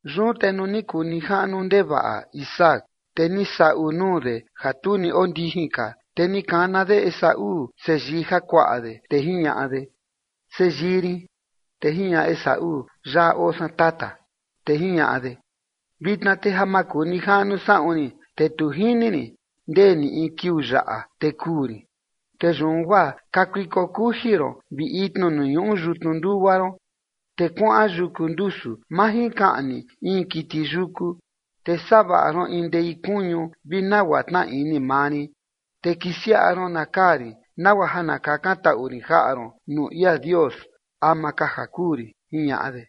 Yun te nuu ni kuu nijaꞌnu ndevaꞌa Isaac, te ni saꞌu nuu de ja tu ni ondijin ka, te ni kana de Esaú seyii jakuaꞌa de, te jiñaꞌa de: ―Seyii rin. Te jiñaꞌa Esaú: ―Yaꞌa oo san, tata. Te jiñaꞌa de: ―Vitna te ja makunijaꞌnu saꞌun rin, te tu jini rin ndee ni in kiuu yaꞌa te kuu rin. Te yun guaa kakuiko kuji ron vi itni nuu ñuꞌu yutnu ndugua ron, te kuaꞌan yuku ndusu majinkaꞌni in kiti yuku. Te savaꞌa ron in ndei kuñu vi nagua tnaa ini maa rin, te kisiaꞌa ron na kaa rin, nagua ja na kakantaꞌu rin jaꞌa ron nuu ia Dios ama ka ja kuu rin ―jiñaꞌa de.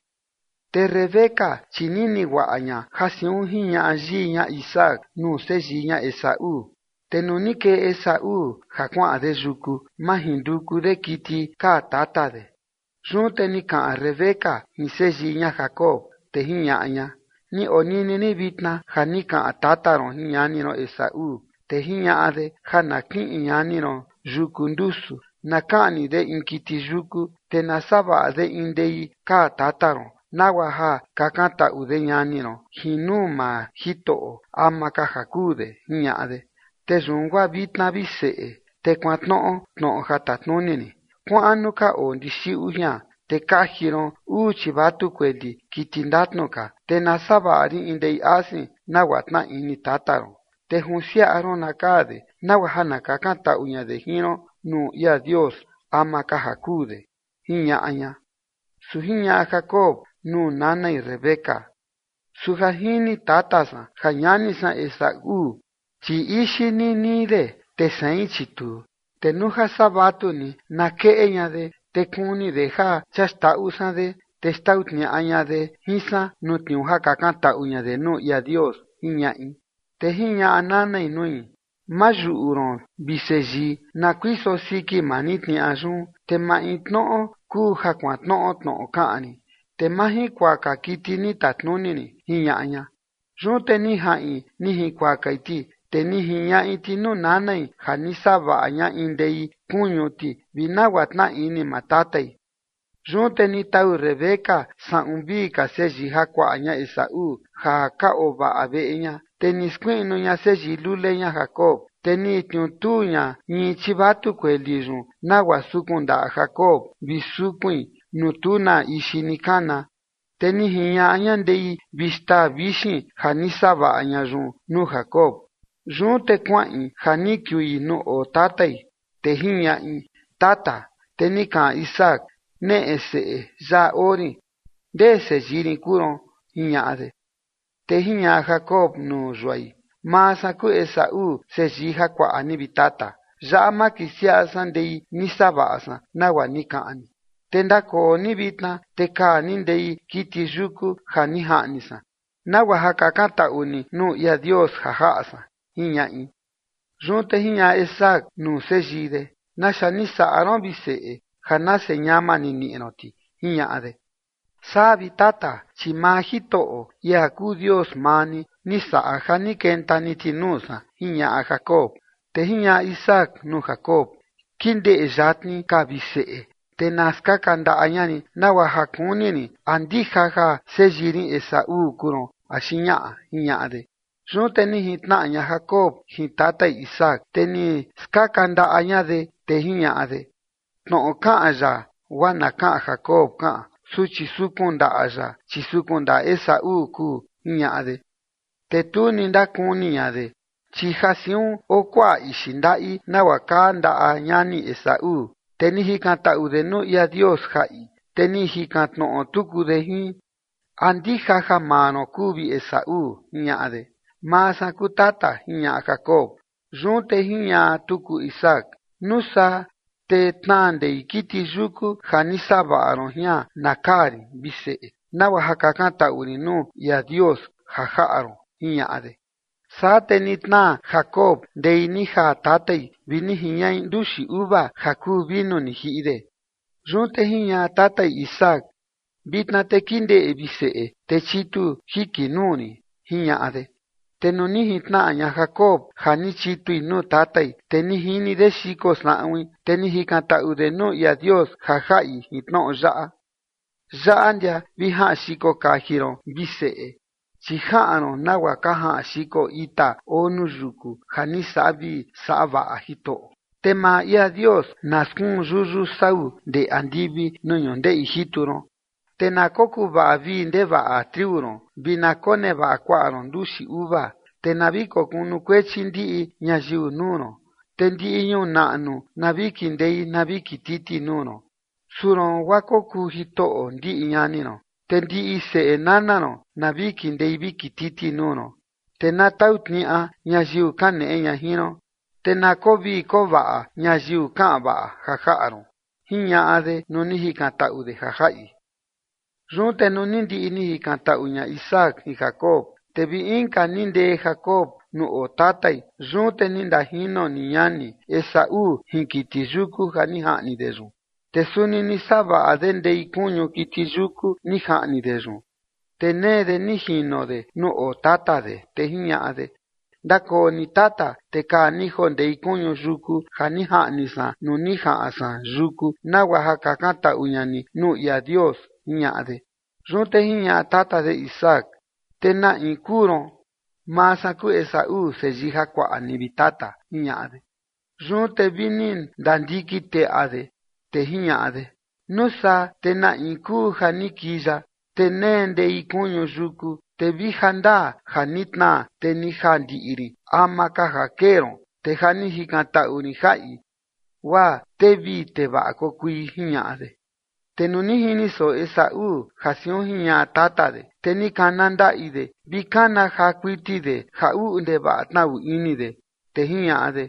Te Rebeca, chi nini guaꞌa ña ja siun jiñaꞌa yii ña Isaac nuu seyii ña Esaú. Te nuu ni kee Esaú ja kuaꞌan de yuku majinduku de kiti kaa tata de, yun te ni kaꞌan Rebeca jin seyii ña Jacob, te jiñaꞌa ña: ―Ni onini rin vitna ja ni kaꞌan tata ron jin ñani ron Esaú, te jiñaꞌa de ja na kiꞌin ñani ron yuku ndusu na kaꞌni de in kiti yuku, te na savaꞌa de in ndei kaa tata ron, nagua ja kakantaꞌu de ñani ron jin nuu maa Jitoꞌo ama ka ja kuu de, jiñaꞌa de. Te yun guaa vitna, vi seꞌe, te kuantnoꞌo tnoꞌo ja tatnuni rin. Kuaꞌan nuu ka oo ndixiꞌu jian, te kaji ron uu chivatu kueli, kiti ndatnu ka, te na savaꞌa rin in ndei asin, nagua tnaa ini maa tata ron. Te junsiaꞌa ron na kaa de, nagua ja na kakantaꞌu ña de jin ron nuu ia Dios ama ka ja kuu de ―jiñaꞌa ña. Su jiñaꞌa Jacob nuu nanai Rebeca: ―Su ja jini tata san ja ñani san Esaú, chi ixi ninii de, te sein, chi tuu. Te nuu saa vatu ni na keꞌe ña de, te kuni de ja chia xndaꞌu san de, te xtau tniaꞌa ña de jin san nuu tniuu ja kakantaꞌu ña de nuu ia Dios ―jiñaꞌi. Te jiñaꞌa nanai nui: ―Ma yuꞌu ron, vi seyii, na kuiso siki maa rin tniaꞌa yun, te maintnoꞌo kuu ja kuantnoꞌo tnoꞌo kaꞌan rin, te majinkuaka kiti ni tatnuni rin ―jiñaꞌa ña. Yun te ni jaꞌin ni jinkuakai ti, te ni jiñaꞌi ti nuu nanai ja ni savaꞌa ña in ndei kuñu ti vi nagua tnaa ini maa tatai. Yun te ni tau Rebeca saꞌun vii ka seyii jakuaꞌa ña Esaú ja ka ovaꞌa veꞌe ña, te ni skuiꞌnu ña seyii lule ña Jacob. Te ni tniutuu ña ñii chivatu kueli yun, nagua sukun ndaꞌa Jacob vi sukuin nuu tu na ixi ni kana. Te ni jiñaꞌa ña ndei vi xtaa vixin ja ni savaꞌa ña yun nuu Jacob. Yun te kuaꞌin ja ni kiui nuu oo tatai, te jiñaꞌi: ―Tata. Te ni kaꞌan Isaac: ―Neꞌe, seꞌe. Yaꞌa oo rin. ¿Ndee seyii rin kuu ron? ―jiñaꞌa de. Te jiñaꞌa Jacob nuu yuai: ―Maa san kuu Esaú seyii jakuaꞌa ni, vi tata. Yaꞌa makisiaꞌa san ndei ni savaꞌa san, nagua ni kaꞌan ni. Te ndakoo ni vitna, te kaa ni ndei kiti yuku ja ni jaꞌni san, nagua ja kakantaꞌu ni nuu ia Dios ja jaꞌa san ―jiñaꞌi. Yun te jiñaꞌa Isaac nuu seyii de: ―¿Naxa ni saꞌa ron, vi seꞌe, ja nase ñama ni niꞌi ron ti? ―jiñaꞌa de. ―Saa, vi tata, chi maa Jitoꞌo, ia kuu Dios maa ni, ni saꞌa ja ni kenta ni ti nuu san ―jiñaꞌa Jacob. Te jiñaꞌa Isaac nuu Jacob: ―Kindeꞌe yatni ka, vi seꞌe, te na skaka ndaꞌa ña rin, nagua ja kuni rin a ndija ja seyii rin Esaú kuu ron axi ñaꞌa ―jiñaꞌa de. Yun te ni jintnaꞌa ña Jacob jin tatai Isaac, te ni skaka ndaꞌa ña de, te jiñaꞌa de: ―Tnoꞌo kaꞌan yaꞌa guaa na kaꞌan Jacob kaꞌan, su chi sukun ndaꞌa yaꞌa, chi sukun ndaꞌa Esaú kuu ―jiñaꞌa de. Te tu ni ndakuni ña de, chi ja siun oo kuaꞌa ixi ndaꞌi, nagua kaa ndaꞌa ñani Esaú, te ni jikantaꞌu de nuu ia Dios ja jaꞌi. Te ni jikan tnoꞌo tuku de jin: ―¿A ndija ja maa ron kuu vi Esaú? ―jiñaꞌa de. ―Maa san kuu, tata ―jiñaꞌa Jacob. Yun te jiñaꞌa tuku Isaac: ―Nuu saa te tnaa ndei kiti yuku ja ni savaꞌa ron jian na kaa rin, vi seꞌe, nagua ja kakantaꞌu rin nuu ia Dios ja jaꞌa ron ―jiñaꞌa de. Saa te ni tnaa Jacob ndei ni jaa tatai vi ni jiñaꞌi nduxi uva ja kuu vinu ni jiꞌi de. Yun te jiñaꞌa tatai Isaac: ―Vitna te kindeꞌe, vi seꞌe, te chitu jiki nuu rin ―jiñaꞌa de. Te nuu ni jintnaꞌa ña Jacob ja ni chitui nuu tatai, te ni jini de xiko saꞌuin, te ni jikantaꞌu de nuu ia Dios ja jaꞌi jin tnoꞌo yaꞌa: Yaꞌa ndia vi jaꞌan xiko kaji ron, vi seꞌe, chi jaꞌan ron nagua ka jaꞌan xiko ita oo nuu yuku ja ni saꞌa vii saꞌa vaꞌa Jitoꞌo. Te maa ia Dios na skuun yuyu sau ndee andivi nuu ñundeꞌi jitu ron, te na kokuvaꞌa vii ndevaꞌa triu ron vi na konevaꞌa kuaꞌa ron nduxi uva. Te na vi kokunukuechi ndiꞌi ñayiu nuu ron, te ndiꞌi ñuu naꞌnu na vi kindei na vi kititi nuu ron. Suu ron guaa kokuu jitoꞌo ndiꞌi ñani ron, te ndiꞌi seꞌe nana ron na vi kindei vi kititi nuu ron. Te na tau tniaꞌa ñayiu kaneꞌe ña jin ron te na koo vii koo vaꞌa ñayiu kaꞌan vaꞌa ja jaꞌa ron, jiñaꞌa de nuu ni jikantaꞌu de ja jaꞌi. Yun te nuu ni ndiꞌi ni jikantaꞌu ña Isaac jin Jacob, te vi inka ni ndee Jacob nuu oo tatai. Yun te ni ndajino ni ñani Esaú jin kiti yuku ja ni jaꞌni de yun. Te suni ni savaꞌa de ndei kuñu kiti yuku ni jaꞌni de yun, te nee de ni jino de nuu oo tata de, te jiñaꞌa de: ―Ndakoo ni tata, te kaa ni joo ndei kuñu yuku ja ni jaꞌni san nuu ni jaꞌan san yuku, nagua ja kakantaꞌu ña ni nuu ia Dios ―jiñaꞌa de. Yun te jiñaꞌa tata de Isaac: ―¿Te na in kuu ron? ―Maa san kuu Esaú seyii jakuaꞌa ni, vi tata ―jiñaꞌa de. Yun te vi ni ndandiki teteꞌa de, te jiñaꞌa de: ―Nuu saa te na in kuu ja ni kii yaꞌa, te nee ndei kuñu yuku, te vi jandaa ja ni tnaa, te ni jaa ndiꞌi rin ama ka ja kee ron. Te ja ni jikantaꞌu rin ja jaꞌi, guaa tee vii tee vaꞌa kokui ―jiñaꞌa de. Te nuu ni jini soꞌo Esaú ja siun jiñaꞌa tata de, te ni kana ndaꞌi de vi kana jaa kuiti de ja uꞌu ndevaꞌa tnaꞌu ini de, te jiñaꞌa de: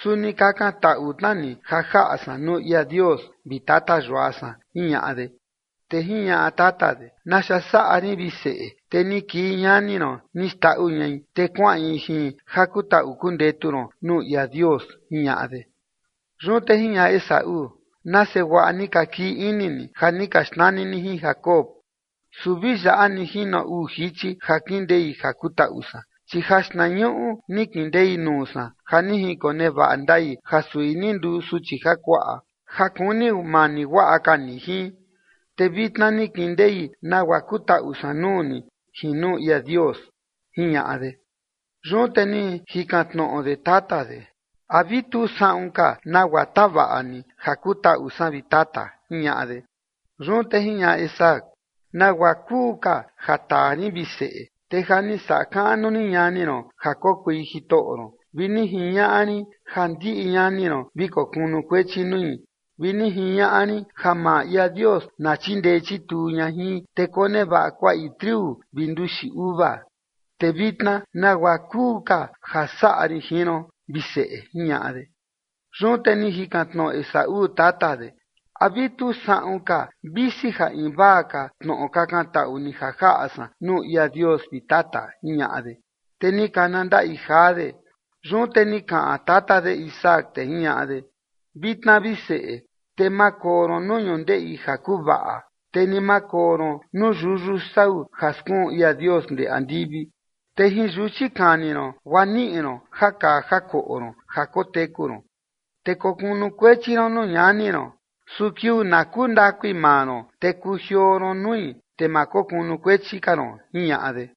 ―Suni kakantaꞌu tna ni ja jaꞌa san nuu ia Dios, vi tata yua san ―jiñaꞌa de. Te jiñaꞌa tata de: ―¿Naxa saꞌa rin, vi seꞌe, te ni kii ñani ron ni xndaꞌu ñai, te kuaꞌin jin ja kutaꞌu kundetu ron nuu ia Dios? ―jiñaꞌa de. Yun te jiñaꞌa Esaú: ―Nase guaꞌa ni ka kii ini ni ja ni ka xnani ni jin Jacob, su vi yaꞌa ni jino uu jichi ja kindei ja kutaꞌu san, chi jaxtnañuꞌu ni kindei nuu san ja ni jinkonevaꞌa ndai ja sui ni nduu suchi jakuaꞌa ja kuni mani guaꞌa ka ni jin, te vitna ni kindei nagua kutaꞌu san nuu ni jin nuu ia Dios ―jiñaꞌa de. Yun te ni jikan tnoꞌo de tata de: ―¿A vi tu saꞌun ka nagua tavaꞌa ni ja kutaꞌu san, vi tata? ―jiñaꞌa de. Yun te jiñaꞌa Isaac: ―¿Nagua kuu ka ja taa rin, vi seꞌe, te ja ni saꞌa kaꞌnu rin ñani ron ja kokui jitoꞌo ron vi ni jiñaꞌa rin ja ndiꞌi ñani ron vi kokunukuechi nui, vi ni jiñaꞌa rin ja maa ia Dios na chindee chituu ña jin, te konevaꞌa kuaꞌi triu vi nduxi uva? ¿Te vitna nagua kuu ka ja saꞌa rin jin ron, vi seꞌe? ―jiñaꞌa de. Yun te ni jikan tnoꞌo Esaú tata de: ―¿A vi tu saꞌun ka visi ja invaa ka tnoꞌo kakantaꞌu ni ja jaꞌa san nuu ia Dios, vi tata? ―jiñaꞌa de. Te ni kana ndaꞌi jaa de. Yun te ni kaꞌan tata de Isaac, te jiñaꞌa de: Vitna, vi seꞌe, te ma koo ron nuu ñundeꞌi ja kuvaꞌa, te ni ma koo ron nuu yuyu sau ja skuun ia Dios ndee andivi. Te jin yuchi kani ron guaa niꞌi ron ja kaa ja koꞌo ron ja koteku ron. Te kokunukuechi ron nuu ñani ron, su kiuu na kundakui maa ron te kujioo ron nui te ma kokunukuechi ka ron, jiñaꞌa de.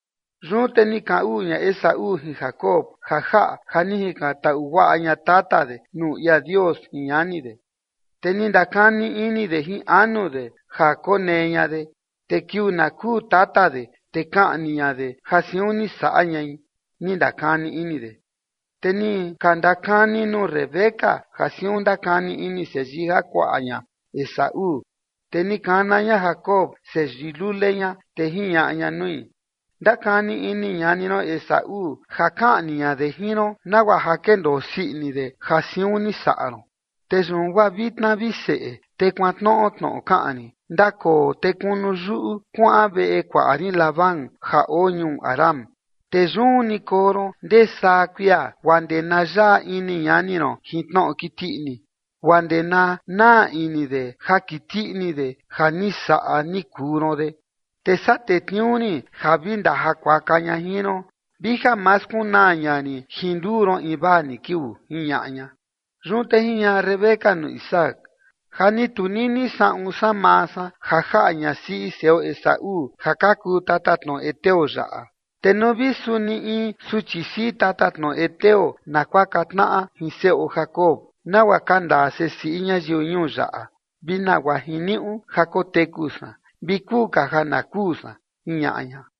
Yun te ni kaꞌan uꞌu ña Esaú jin Jacob ja jaꞌa ja ni jikantaꞌu guaꞌa ña tata de nuu ia Dios jin ñani de, te ni ndakani ini de jin anu de ja konee ña de, te kiuu na kuu tata de, te kaꞌni ña de ja siun ni saꞌa ñai, ni ndakani ini de. Te ni ka ndakani nuu Rebeca ja siun ndakani ini seyii jakuaꞌa ña Esaú. Te ni kana ña Jacob seyii lule ña, te jiñaꞌa ña nui: ―Ndakani ini ñani ron Esaú ja kaꞌni ña de jin ron nagua ja kendoo sii ini de ja siun ni saꞌa ron. Te yun guaa vitna, vi seꞌe, te kuantnoꞌo tnoꞌo kaꞌan rin, ndakoo te kunu yuꞌu kuaꞌan veꞌe kuaꞌa rin Labán ja oo ñuu Harán. Te yun ni koo ron ndee saa kuia guaa ndee na yaꞌa ini ñani ron jin tnoꞌo kiti ini, guaa ndee na naa ini de ja kiti ini de ja ni saꞌa ni kuu ron de. Te saa tetniuu rin ja vi ndajakuaka ña jin ron vi ja ma skunaa ña rin jin nduu ron invaa ni kiuu ―jiñaꞌa ña. Yun te jiñaꞌa Rebeca nuu Isaac: ―Ja ni tunini saꞌun san maa san ja jaꞌa ñasiꞌi seꞌo Esaú ja ka kuu tatatnoꞌo heteo yaꞌa. Te nuu vi suni in suchi siꞌi tatatnoꞌo heteo na kuaka tnaꞌa jin seꞌo Jacob, nagua ka ndaa sesiꞌi ñayiu ñuu yaꞌa, ¿vi nagua jiniuꞌu ja koteku san? Vi kuu ka ja na kuu san ―jiñaꞌa ña.